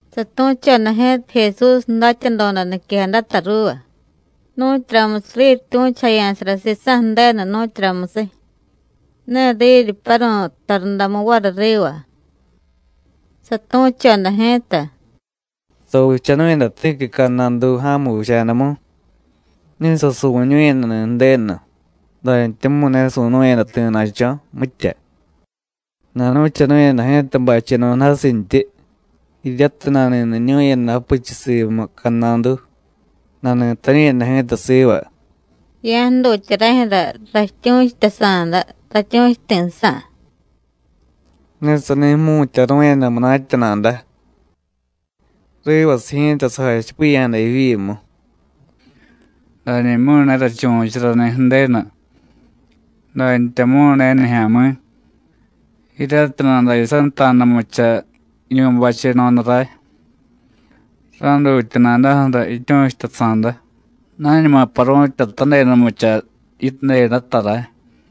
Satu̱choda ji̱ta Jesús datyadoda niquejadata ruuva, nu̱tyuramusiy riryityu̱chujaya̱sara sisa̱ Ju̱denu, nu̱tyuramusiy, ne riryipyaru̱y tarundamu variy riva. Satu̱choda ji̱ta: “Savichanu̱yada ti̱qui cadnadu, ja̱mu vicha̱damu. Ne sasuvu̱ñu̱yadani̱ Ju̱denu, dantyamu̱y ne su̱nu̱yada ti̱na̱cho̱, mitya. Nanuvichanu̱yada ji̱ta bacheno̱da jasintyi, jiryatiy nani̱niñu̱yada japichiy simu cadnadu, nani̱tañu̱yada ji̱ta siva: Ya̱jdutya rajyu̱ra ratyu̱chutasa̱da ratyu̱chuti̱sa̱. Ne sani jmu̱tyaru̱yada munatya nada. Rivasiy ji̱ta sajachipiya̱jada jivyimu: Danimyu̱y ne rachuvu̱charani̱ Ju̱denu, dantyamu̱y ne nijya̱mi̱, jiryatiy nadayasanta̱danumucha jiñu̱y bacheno̱da ray, ra̱jdutya nadaju̱ra jityu̱chutasa̱da, nañuma paru̱tyatadedanumucha yidedata ray.”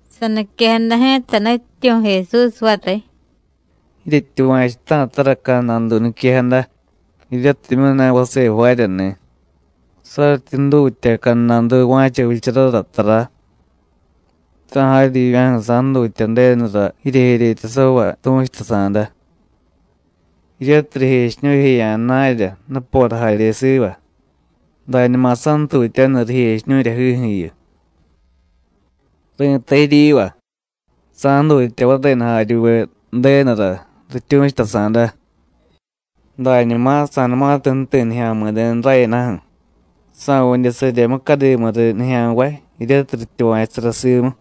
Saniquejada ji̱ta Nutyityu̱ Jesús variy: “Jiryetyuva̱chuta̱tara cadnadu niquejada, jiryatimyu̱ ne vase jvaaryani̱. Saryityi jdutya cadnadu va̱cha vicharara tara, ¡ta̱ jaryivya̱ju̱ sa̱jdutya Ju̱denura jijeryetasavay tu̱chutasa̱da, jiryatiy rijechiñu̱jeya̱ jna̱rya, nupora jarye siva, dañuma santutyaniy rijechiñu̱ryajiju̱yu! Ri̱tay jiryiva: Sa̱jdutya varenu jaryuve Ju̱denura rityu̱chutasa̱da. Dañuma sa̱numatiy ju̱ti̱ Nijya̱mi̱denu rayadaju̱ ¿sa̱vidye sarye mucadimu riy nijya̱nvay jiryatiy rityuva̱chusara simu?”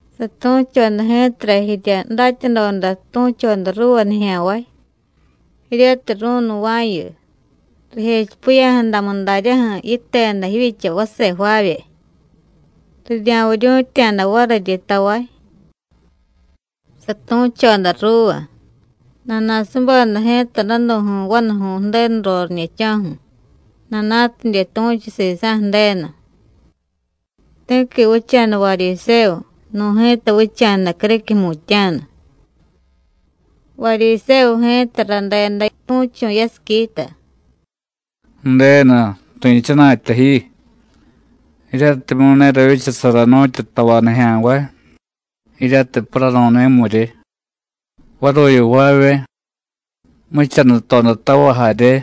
Satu̱choda ji̱tara jirya datyadoda tu̱choda ruuva nijya̱nvay, jiryatiy ru̱nnuva̱yu, rijechipiya̱jadamu daryaju̱ yiteda jivyicha vase jvaavye, rirya̱viryu̱tya̱da variryi tavay. Satu̱choda ruuva: “Nana̱subeda ji̱ta danu̱ju̱y vanuju̱y Ju̱denu roriñe̱cho̱ju̱, nana̱tidye tu̱chu sisa̱ Ju̱denu. Ti̱qui vicha̱da Varyisévu, nu̱ ji̱ta vicha̱da criquiy jmutya̱nu. Varyisévu ji̱ta radeda tu̱chu̱ yasiquita: Ju̱denu, ri̱chana̱tya ji, jiryatimyu̱ ne ravyichasara nu̱tyu tavay nijya̱nvay, jiryatiy paranu̱ni̱miryi, varuyu jvaavye, jmuchanutodatavay jarye,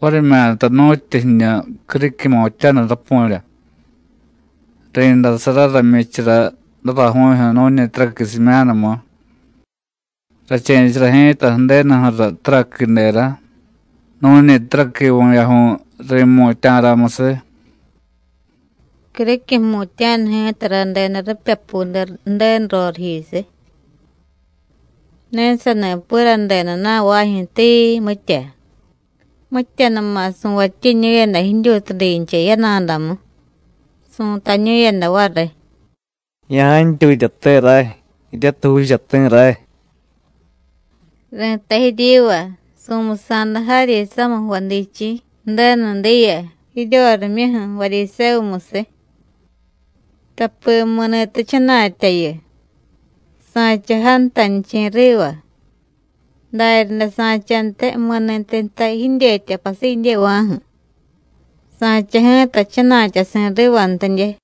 varimyata nu̱tyu jiñu criquiy jmutya̱nu rapu̱rya. Ri̱ndasarara jmyichara daraju̱jyu̱ nu̱ñi taraqui simyanumu; rache̱chara ji̱ta Ju̱denuju̱ra taraquidera nu̱ñi taraqui vu̱yaju̱y ri̱mutya̱ramusiy. Criquiy jmutya̱nu ji̱ta radeda ripyapude Ju̱denu roriyjisiy, ne sani piradeda na̱vajyu̱, tii, mitya. Mityanuma su̱vatyiñu̱yada jidyutudincha yana̱damu, su̱tañu̱yada variy: ¡Ya̱jantyutyate ray, jiryatiy juuchati̱ ray! Ri̱tay jiryiva: Su̱musa̱da jaryi samiy jvadichi̱ Ju̱denu diya jiryorimyuju̱ Varyisévumusiy, tapi mi̱ni̱tyi jchana̱tyayu, sa̱cha jantanichi̱ riva; daryaday sa̱chantiy mi̱ni̱tyi jtay jidyetya pasidyeva̱ju̱, sa̱cha ji̱ta jchana̱tyasi̱ rivantidye.”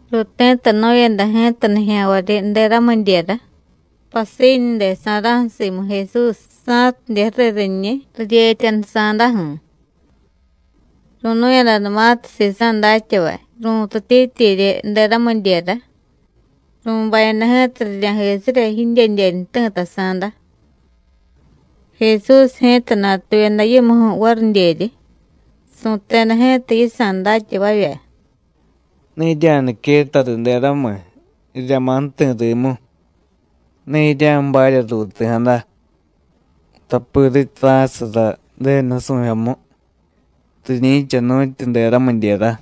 Ruuti̱tanu̱yada ji̱ta nijya̱nvaryi deramidyera pasiñude sa̱ra̱ju̱ simu Jesús, sa̱tidye ju̱riy riñiy, riryetyanusa̱daju̱. Ru̱nu̱yadanumatiy sisa̱ datyavay ru̱tutityiryi deramidyera, ru̱bayada ji̱ta rirya̱jisirya jidyedyeñu jti̱tasa̱da. Jesús ji̱ta natuyada yimuju̱ varidyeryi, su̱teda ji̱ta yisa̱ datyavavya: “Ne jirya̱niquetta riy deramiy, rirya̱ma̱ ju̱ti̱ rimu. Ne jirya̱jbarya ruuti̱jada, tapi rityi ra̱chasara Ju̱denu nusu̱jyomu, riñi̱cha nu̱tyu deramidyera.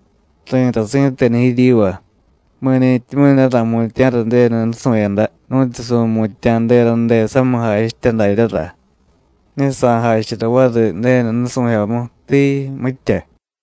Ri̱tay si̱tenu jiryiva: Mi̱ni̱tyimyu̱ ne ra̱jmutya̱ra Ju̱denu nusu̱yada, nu̱tyu su̱mutya̱ derade samiy jachitya daryara, ne sa̱jachara variy Ju̱denu nusu̱jyomu, tii, mitya.”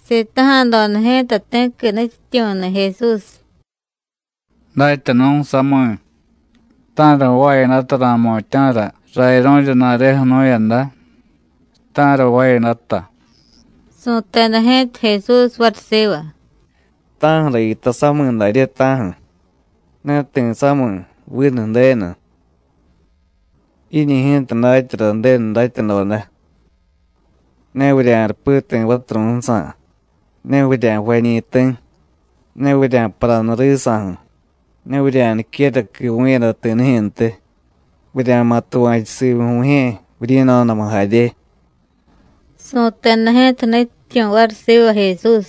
Sitaja̱doda ji̱ta ti̱qui nutyityu̱ni̱ Jesús: “Datyanu̱ sami̱, ¿ta̱ra jvaayadata ra̱jmutya̱ra rayaru̱rya ju̱na̱reju̱ jnu̱yada, ta̱ra jvaayadata?” Su̱teda ji̱ta Jesús variy siva: “¿Ta̱ju̱ra yitay sami̱ darye, ta̱ju̱? Ne ti̱ sami̱, vinu Ju̱denu. Jiñi̱ ji̱ta datyara Ju̱denu datyadoda: Ne vurya̱rupi ti̱ vaturu̱jsa̱, ne vurya̱jvañi̱ ti̱, ne vurya̱paranu risa̱ju̱, ne vurya̱niquera quivu̱yada ti̱nijyu̱ntiy; vurya̱ma̱ tuva̱chu simu vu̱jye̱, vuryi̱no̱damu jarye.” Su̱teda ji̱ta nutyityu̱ variy siva Jesús: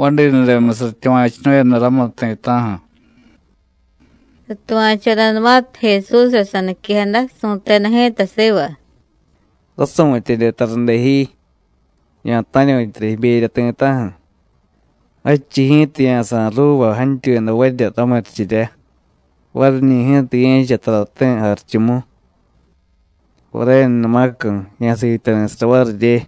“Vadinudemusiy ratyuva̱chunu̱yada ramu ti̱ta̱ju̱.” Satuva̱chodanumatiy Jesúsra saniquejada, su̱teda ji̱ta siva: “Rasu̱tyedye tarade ji. Ya̱ta̱ryu̱tyara jiberya ti̱ta̱ju̱, jadchiy ji̱ta ya̱sa̱y ruuva jantyuyadavarya ramurichirya. Variñi̱ ji̱ta ye̱cha tarati̱ jarichumu. Varenumacu̱, ya̱siityari̱sara varirye.”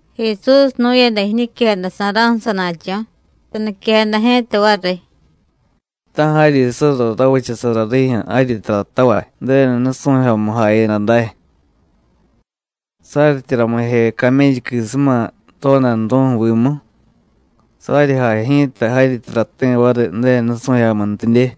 Jesús jnu̱yada jiñiquejada sa̱ra̱ju̱ sana̱cho̱, saniquejada ji̱ta variy: “Ta̱ jaryi surra ravichasara rijyu̱ jaryi taratavay Ju̱denu nusu̱jyomu jayada day. Saryityi ramije camélluquisuma rodanru̱ju̱ vimu, saryi jay ji̱ta jaryi tarati̱ variy Ju̱denu nusu̱jyomuntidye.”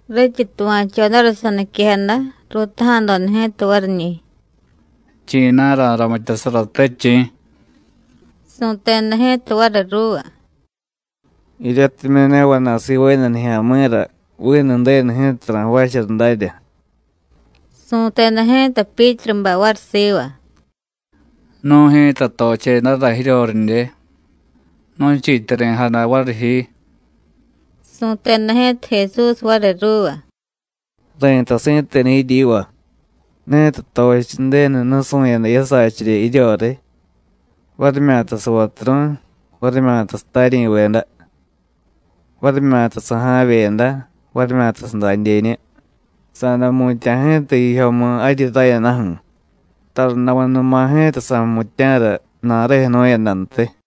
Rityi tuva̱chodara saniquejada, ruutaja̱doda ji̱ta variñi̱: “¿Chi̱na̱ ra̱ramityasarate, chi̱?” Su̱teda ji̱ta variy ruuva: “Jiryatimyu̱ ne vana̱y sivaayada nijya̱mi̱ra, vinu Ju̱denu ji̱ta ra̱jvaachara darya.” Su̱teda ji̱ta Pyítrubay variy siva: “Nu̱y ji̱ta tochedara jiryoridye, nu̱chiityari̱jada variy ji.” Su̱teda ji̱ta Jesús variy ruuva: “Ri̱tay si̱tenu jiryiva: Ni̱tiy tochiy Ju̱denu nusu̱yada jiyasachirya jiryoriy, varimyata savaturu̱y, varimyata sataryi̱veda, varimyata saja̱vyeda, varimyata sadadyeñu, sa̱day jmutya̱ ji̱ta jijyomu jaryi rayadaju̱, tarundamunuma ji̱ta sa̱jmutya̱ra ju̱na̱reju̱ jnu̱yadantiy.”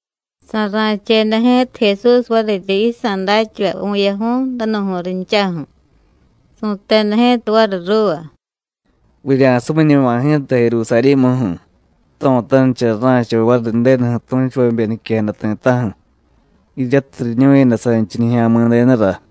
Sa̱ra̱cheda ji̱ta Jesús variryi yisa̱ datyavay, vu̱yaju̱y, danu̱ju̱y rinchaju̱, su̱teda ji̱ta variy ruuva: “Vurya̱sumiñuma ji̱ta Jerusarí̱muju̱. Jto̱tanichara ra̱cha variy Ju̱denuju̱ tu̱chuvabe niquejada ti̱ta̱ju̱, jiryatiy riñu̱yada sanchiy Nijya̱mi̱denura.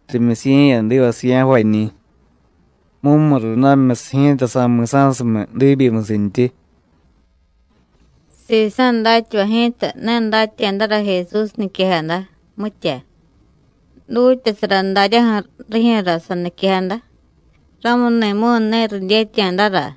Rimyusiye̱yadivasiy ya̱jvañi̱. Mumurundamimyusiy ji̱ta, sa̱mi̱sa̱sumiy diibyimusintyi.” Sisa̱ datyavay ji̱ta, ne datya̱dara Jesús niquejada, mitya. Dutyasara daryaju̱ rijyu̱ra saniquejada, ramuni̱mu̱y ne ridyetya̱dara.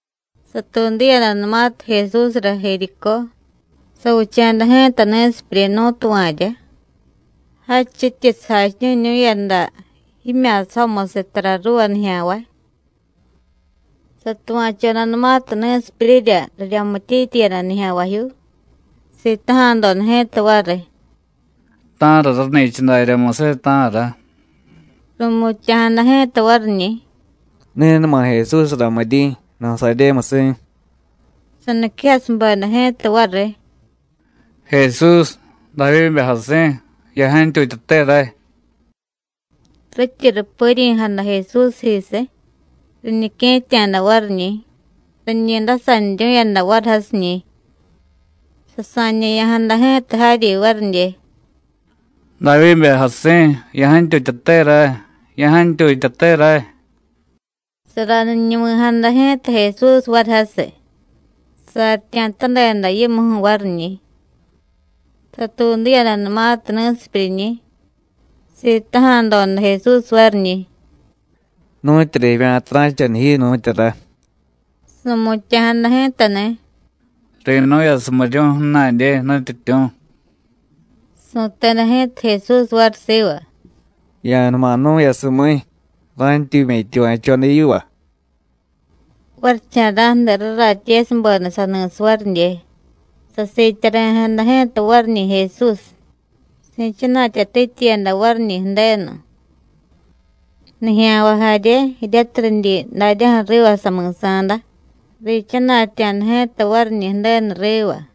Satuudiyadanumatiy Jesúsra Jericó, savicha̱da ji̱ta ni̱sipyuryi nú̱tuva̱rya, jadchityi sajachiñu̱ñu̱yada jimya̱sajomusiy tara ruuva nijya̱nvay. Satuva̱chodanumatiy ni̱sipyuryirya riryamityityiyada nijya̱nvajyuu, sitaja̱doda ji̱ta variy: “¿Ta̱ra rani̱cha daryamusiy, ta̱ra?” Ru̱mutya̱jada ji̱ta variñi̱: “Ni̱numa Jesús ramiryi̱, Nasaryémusi̱.” Saniquejasubeda ji̱ta variy: “¡Jesús, Davyíbe jasi̱, ya̱jantyutyate ray!” Rityi rupiryi̱jada Jesúsjisiy, riñique̱tya̱da variñi̱, riñi ndasaniryu̱yada variy jasiñi̱. Sasa̱ñe̱ya̱jada ji̱ta jaryi varidye: “¡Davyíbe jasi̱, ya̱jantyutyate ray! ¡Ya̱jantyutyate ray!” Saraniñuvi̱jada ji̱ta Jesús variy jasiy, saryitya̱tadeda yimuju̱ variñi̱. Satuudiyadanumatiy ni̱sipyuryiñi̱, sitaja̱doda Jesús variñi̱: “¿Nu̱tyura jivya̱ta ra̱chaniy ji, nu̱tyura?” Su̱mutya̱jada ji̱tani̱: “¡Ri̱nu̱yasumiryu̱y ju̱na̱dye, Nutyityu̱!” Su̱teda ji̱ta Jesús variy siva: “Ya̱numa jnu̱yasumíy, ra̱ntyumya̱ jityuva̱choda yiva.” Varicha̱ra̱ju̱de raratyesubeda sani̱siy varidye, sasiityari̱jada ji̱ta variñi̱ Jesús, si̱chana̱tyatityiyada variñi̱ Ju̱denu. Nijya̱nvay jarye, jiryatiy ridyi daryaju̱ riva sami̱sa̱da, riichana̱tya̱da ji̱ta variñi̱ Ju̱denu riva.